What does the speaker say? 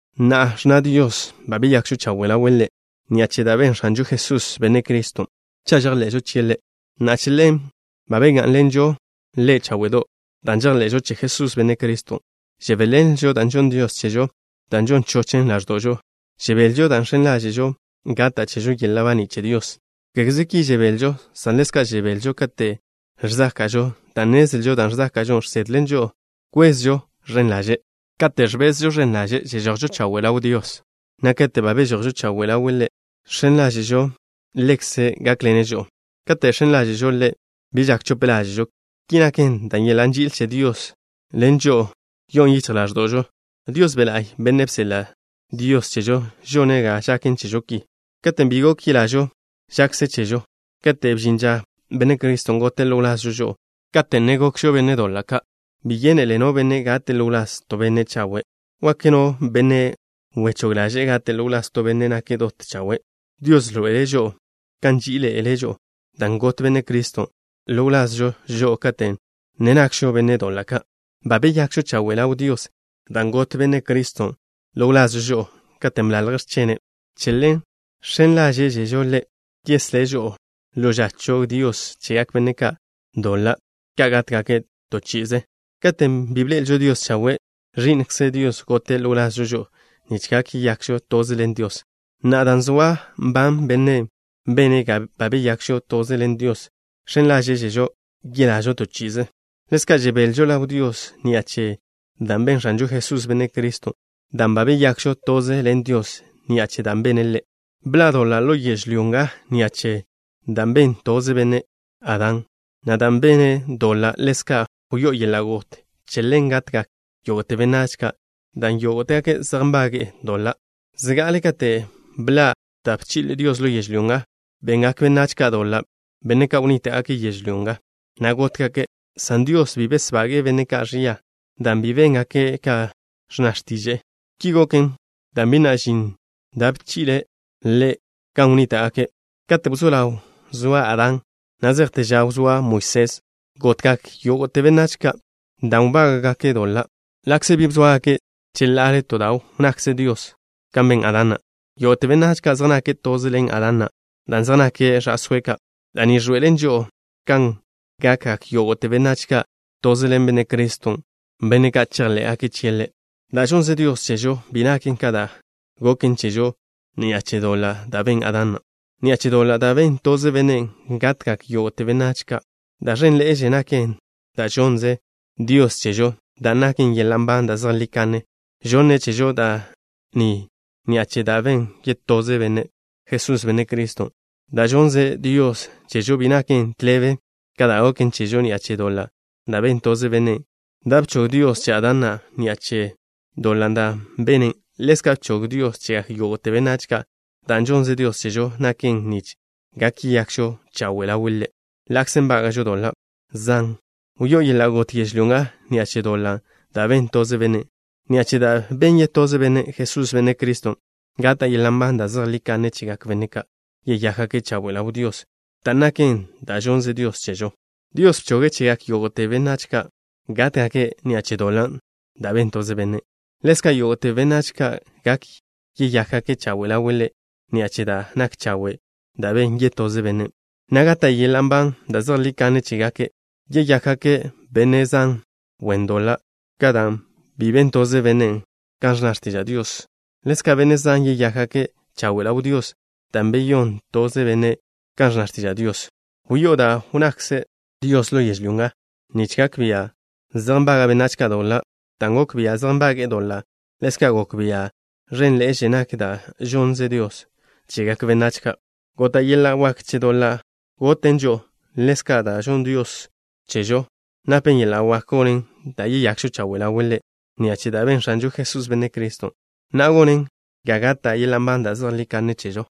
Na'a, ẕnna Dios ba beyakžo chawe' ḻawe' Ḻe' ni'a che da' ben X̱anžo Jesús, Benne' Criston', cha' žejḻe'žo chie' Ḻe', na' che ḻen ba begá'nḻenžo Ḻe' cháwe'do'. Dan' žejḻe'žo che Jesús, Benne' Criston', žebéḻenlžo da' žonn Dios chežo, dan' žon chochen ḻáẕdo'žo. Žebelžo dan' žx̱en ḻáže'žo gata' chežo yeḻa' baní' che Dios. Kégeze ki žebelžo, san ḻezka' žebelžo kate' ẕzáka'žo, dan' nnezlžo da' ẕzáka'žo žsedlen žo'o kwezžo ẕen ḻaže'. Kate' ẕbezžo ẕen ḻaže' žežojžo chawe' ḻaw Dios, na' kate' ba bežojžo chawe' ḻawe' Ḻe' žx̱en ḻáže'žo Ḻekze' gákḻene' žo'o. Kate' žx̱en ḻáže'žo Ḻe', bi žak chope ḻáže'žo. Ki naken dan' yeḻa' nži'il che Dios ḻen žo'o yo'on yichj ḻáẕdo'žo. Dios Be' La'y, Bennen' bseḻa' Dios chežo, žone' ga žaken chežo ki. Katen' bi gok yelažo žakze chežo, kate' bžin ža, Benne' Criston' gote' ḻo wlazžo žo'o, kate' ne gokžo benne' doḻa' ka'. Bi yénele no benne' gate' ḻo wláz to benne' chawe'. Wak no benne' wechóg ḻaže'e gate' ḻo wláz to benne' nake' dot chawe'. Dios ẕḻoe'ele' žo'o kan nží'iḻe'ele' žo'o, dan' got Benne' Criston' ḻo wlazžo žo'o kate' ne gokžo benne' doḻa' ka'. Ba beyakžo chawe' ḻaw Dios dan' got Benne' Criston' ḻo wlazžo žo'o, katen' bḻalje' x̱chene'. Che ḻen žx̱en ḻáže'žežo Ḻe' yeslé' žo'o ḻo ža chog Dios chegak benne' doḻa' ka' gátgake' to chi'ize. Katen' bi bḻe'elžo Dios chawe', Ẕi'nkze Dios gote' ḻo wlazžo žo'o nich gak yeyakžo toze ḻen Dios. Na'a, dan' zoa nban Bennen' bene' ga ba beyakžo toze ḻen Diosen', žx̱en ḻáže'žežo yelažo to chi'ize. Ḻezka' žebelžo ḻaw Dios ni'a che da' ben X̱anžo Jesús, Benne' Criston', dan' ba beyakžo toze ḻen Diosen' ni'a che da' bene' Ḻe'. Bḻa' doḻa' ḻo yežlyó nga ni'a che da' ben toze benne', Adán, na' dan' bene' doḻa', ḻezka' wyó'o yeḻa' got. Che ḻen gatgak yógo'te benách ka' dan' yógo'tegake' zej nbage'e doḻa'. Zga'ale kate' bḻa' da' bchi'le Dios ḻo yežlyó nga, bengak benách ka' doḻa', benne' ka' wnníta'gake' yežlyó nga, na' gótgake', san Dios bi besbage'e benne' ka' ẕia dan' bi béngake' ka ẕnna x̱tiže'e. Ki goken dan' bi na' žin da' bchi'le' Ḻe' gan wnníta'gake'. Kate' wzó ḻaw zoa Adán, na' zejte ža wzóa Moisés gotgak yógo'te benách ka' dan' wbága'gake' doḻa', ḻa'kze bi bzóagake' cheḻa'ale to da' wnnakze Dios kan ben Adán na'. Yógo'te benách ka' zej nake' toze ḻen Adán na' dan' zej nake' ẕa'sóe' ka'. Da' ni ẕḻoe'elen žo'o kan gakgak yógo'te benách ka' toze ḻen Benne' Criston', benne' ka' chejḻé'gake' chie' Ḻe'. Da' žonnze Dios chežo bi naken ka da' goken chežo ni'a che doḻan' da' ben Adán na'. Ni'a che doḻan' da' ben toze bennen', gatgak yógo'te benách ka'. Da' ẕénḻe'eže naken da' žonnze Dios chežo, dan' naken yeḻa' nban da' zejlí kanne. Žonne' chežo da' ni ni'a che da' ben yetoze Benne', Jesús, Benne' Criston'. Da' žonnze Dios chežo bi naken tḻebe ka da' goken chežo ni'a che doḻan' da' ben toze bennen'. Da' bchog Dios che Adán na' ni'a che doḻan' da' bene', ḻezka' bchog Dios chegak yógo'te benách ka'. Dan' žonnze Dios chežo naken nich gak yeyakžo chawe' ḻawe' Ḻe' ḻa'kze nbága'žo doḻa' zan. Wyó'o yeḻa' got yežlyó nga ni'a che doḻan' da' ben toze bennen'. Ni'a che da' ben yetoze Bennen', Jesús, Benne' Criston', gata' yeḻa' nban da' zejlí kanne chegak benne' ka' yeyákgake' chawe' ḻaw Dios, dan' naken da' žonnze Dios chežo. Dios bchoge' chegak yógo'te benách ka' gátgake' ni'a che doḻan' da' ben toze bennen'. Ḻezka' yógo'te benách ka' gak yeyákgake' chawe' ḻawe' Ḻe' ni'a che da' nak chawe' dan' ben yetoze Bennen', na' gata' yeḻa' nban da' zejlí kanne chégake'. Beyakgak benne' zan wen doḻa' ka' dan' bi ben toze bennen' kan ẕnna x̱tiža' Dios. Ḻezka' benne' zan yeyákgake' chawe' ḻaw Dios dan' ben yetoze Bennen' kan ẕnna x̱tiža' Dios. Wyó'o da' wnnakze Dios ḻo yežlyó nga nich gak bia' zej nbaga' benách ka' doḻa'. Dan' gok bia' zej nbage'e doḻa', ḻezka' gok bia' ẕénḻe'eže nak da' žonnze Dios chegak benách ka'. Gota' yeḻa' wak che doḻa' goten žo'o. Ḻezka' da' žonn Dios chežo napen yeḻa' wak gonen ga yeyakžo chawe' ḻawe' Ḻe' ni'a che da' ben X̱anžo Jesús, Benne' Criston', na' gonen ga gata' yeḻa' nban da' zejlí kanne chežo.